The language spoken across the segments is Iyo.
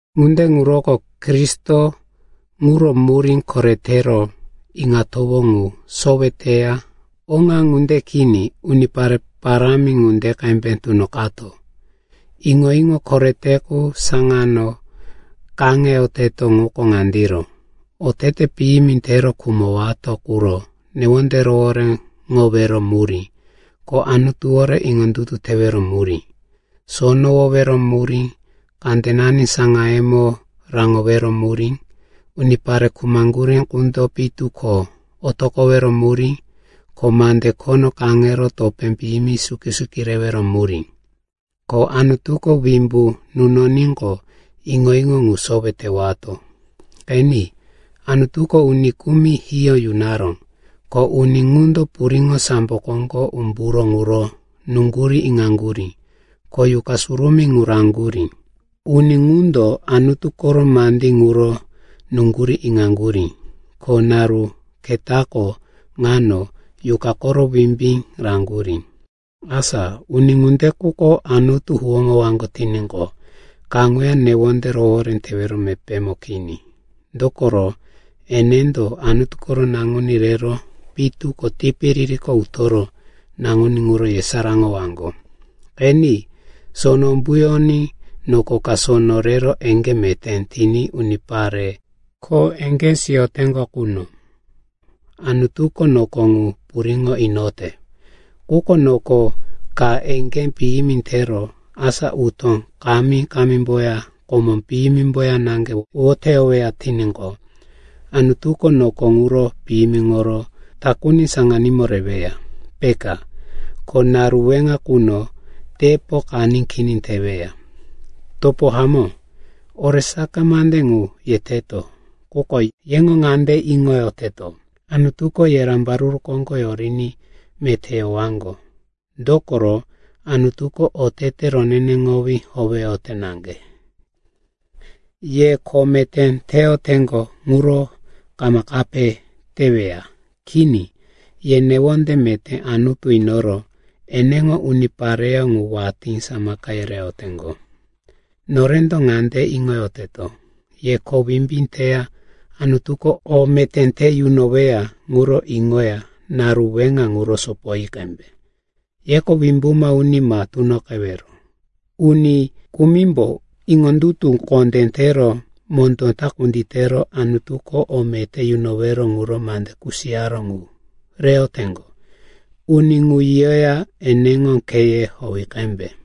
Ŋunde ŋuroko Kristo ŋuro murí koretero iŋatowó ŋu sowe teya oŋa ŋunde kini unipare parámi ŋunde qembe tunoqato. Iŋo-iŋo korete qu saŋano kaŋeyoteto ŋuko ŋandiro: otete piyimi tero khumowato quro newonde rohoréŋowero murí, ko Anutuwore iŋondutu tewero murí, sonowowero murí, kandenani saŋayemo raŋowero murí, unipare khumaŋgurí qundo pitu ko otoqowero murí, ko mande khono kaŋero topé piyimi suki-suki rewero murí. Ko Anutuko wimbu nunoníqo, iŋo-iŋo ŋu sowe tewato. Qeni, Anutuko uni kumi hiyó yunaró, ko uni ŋundo puriŋo sambo koŋgo umburó ŋuro nuŋgurí iŋaŋgurí, ko Yuqa Surumí ŋu raŋgurí. Uni ŋundo Anutu koro mandí ŋuro nuŋgurí iŋaŋgurí, ko naru ketako ŋano Yuqa koro wimbí raŋgurí. Asa uni ŋunde quko Anutu huwóŋowaŋgo tiníqo, kaŋuya newonde rohoré tewero mepémo kini. Dokoro enendo Anutu koro Naŋuní rero pitu ko tipiririko utoro naŋuní ŋuro yesaráŋowaŋgo. Qeni, sono umbuyoní noko ka sono rero eŋgé meté tiní unipare kho eŋgé siyoteŋgo quno, Anutuko noko ŋu puriŋo inote. Quko noko ka eŋgé piyimi tero, asa utó kami-kamimboya komó piyimimboya naŋge woteyoweya tiníqo, Anutuko noko ŋuro piyimiŋoro takuni saŋanímo reweya, peka. Ko naru weŋa quno tepo qaní kini teweya. Topo hamó, oresaka mande ŋu yeteto, quko yeŋo ŋande iŋoyoteto, Anutuko ye rambaruru koŋgo yoriní meté yowaŋgo. Dokoro Anutuko otete roneneŋowí howeyote naŋge, ye kho meté teyoteŋgo ŋuro kama kape teweya. Kini. Ye newonde meté Anutu inoro eneŋo unipareyó ŋu watí samaka yereyoteŋgo. Norendo ŋande iŋoyoteto, ye kho wimbí teya Anutuko o meté te yunoweya ŋuro iŋoya naru weŋa ŋuro sopoyi qembe. Yeko wimbuma uni ma tunoqewero. Uni kumimbo iŋondutu kondé tero mondó ta kunditero Anutuko o meté yunowero ŋuro mande kusiyaró ŋu reyoteŋgo. Uni ŋu yiyoya eneŋo kheye howi qembe.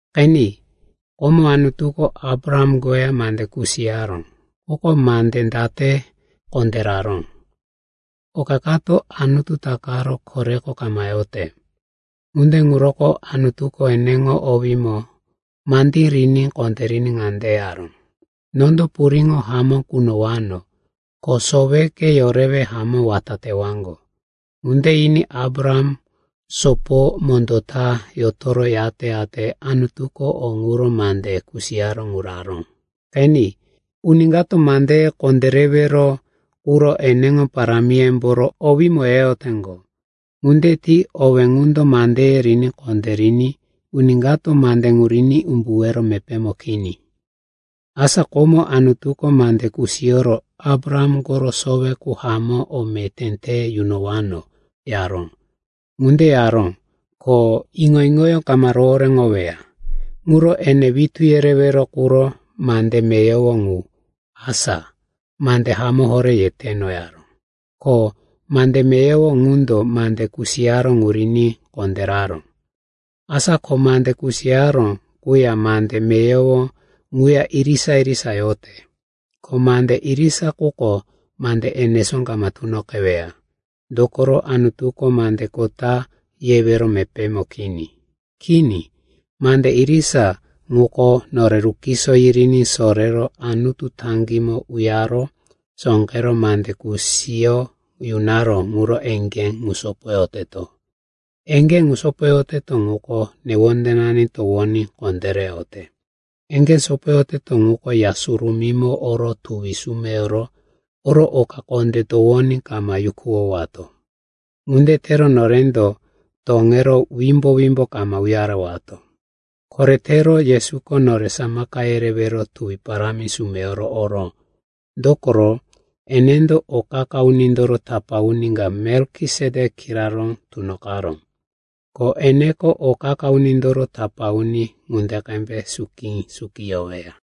Qeni, komo Anutuko Abraham koya mande kusiyaró. Quko mande date kondéraró? Oka kato Anutu takaro koreko kama yote. Ŋunde ŋuroko Anutuko eneŋo owímo mandí riní kondériní ŋande yaró, “Nondo puriŋo hamó kunowano, ko soweke yorewe hamó wata tewaŋgo.” Ŋunde yiní Abraham soporo mondó ta yotoro yate-yate Anutuko o ŋuro mande kusiyaró ŋu raró. Qeni, uni kato mandeye kondérewero quro eneŋo parámiyemboro owímo yeyoteŋgo. Ŋunde ti owé ŋundo mandeye riní kondériní uni kato mande ŋu riní umbuwero mepémo kini. Asa komo Anutuko mande kusiyoro, Abraham koro sowe qu hamó o meté te yunowano, yaró. Ŋunde yaró, ko iŋo-iŋoyó kama rohoréŋoweya. Ŋuro ene witú yerewero quro mande meyowo ŋu, asa, “Mande hamó horé yeteno,” yaró. Ko mande meyowo ŋundo mande kusiyaró ŋu riní kondéraró. Asa ko mande kusiyaró quya mande meyowo ŋuya irisa-irisa yote. Ko mande irisa quko mande enesó kama tunoqeweya, dokoro Anutuko mande kota yewero mepémo kini. Kini, mande irisa ŋuko nore rukiso yiriní sorero Anutu taŋgímo uyare sóqero mande kusiyo yunaró ŋuro eŋgé ŋu sopoyoteto. Eŋgé ŋu sopoyoteto ŋuko newondenani towoní kondéreyote. Eŋgé sopoyoteto ŋuko Ya Surumímo oro tuwi sumeyoro oro oka kondé towoní kama yukuwowato. Ŋunde tero norendo toŋero wimbo-wimbo kama uyarewato. Koretero Yesuko nore samaka yerewero tuwi parámi sumeyoro oró. Dokoro enendo o qa-qa unindoro tapá uni ka Melkisetek kiraró tunoqaró. Ko eneko o qa-qa unindoro tapá uni ŋunde qembe suki-suki yoweya.